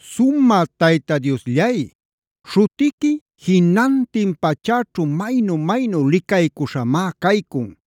¡Sumä Tayta Diosllay, śhutiqui jinantin pachäćhu maynu-maynu licaycuśhamá caycun!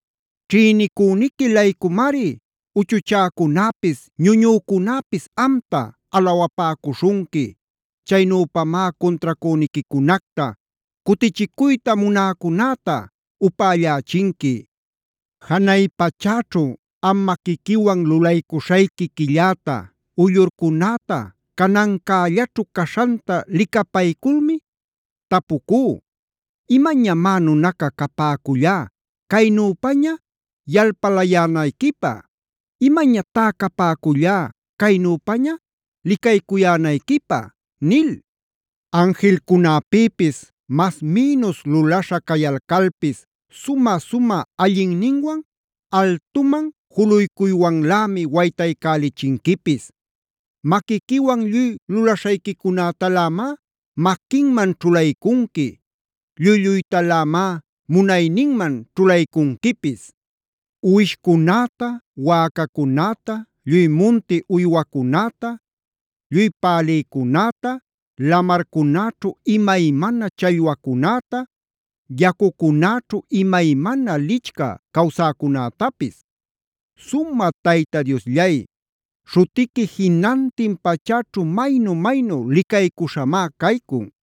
Ćhïnicüniqui-laycumari uchuchäcunäpis ñuñücunäpis amta alawapäcuśhunqui.c Chaynüpamá cuntracüniquicunacta, cutichicuyta munäcunäta upällächinqui. Janay pachäćhu am maquiquiwan lulaśhayqui quilläta, uyllurcunäta canancällaćhu caśhanta licapayculmi, tapucú: “¿Imañamá nunaca capäcullá caynüpaña yalpalayänayquipä? ¿Imañatá capäcullá caynüpaña licaycuyänayquipä?” Anjilcunäpïpis mas mïnus lulaśha cayalcalpis, sumä-sumä allinninwan altuman juluycuywanlämi waytaycälichinquipis. Maquiquiwan lluy lulaśhayquicunätalämá maquinman ćhulaycunqui. Lluy-lluytalämá munayninman ćhulaycunquipis: Uwishcunäta, wäcacunäta, lluy munti uywacunäta, lluy pälïcunäta, lamarcunaćhu imaymana challwacunäta, yacucunäćhu imaymana lichcä cawsäcunätapis. ¡Sumä Tayta Diosllay, śhutiqui jinantin pachäćhu maynu-maynu licaycuśhamá caycun!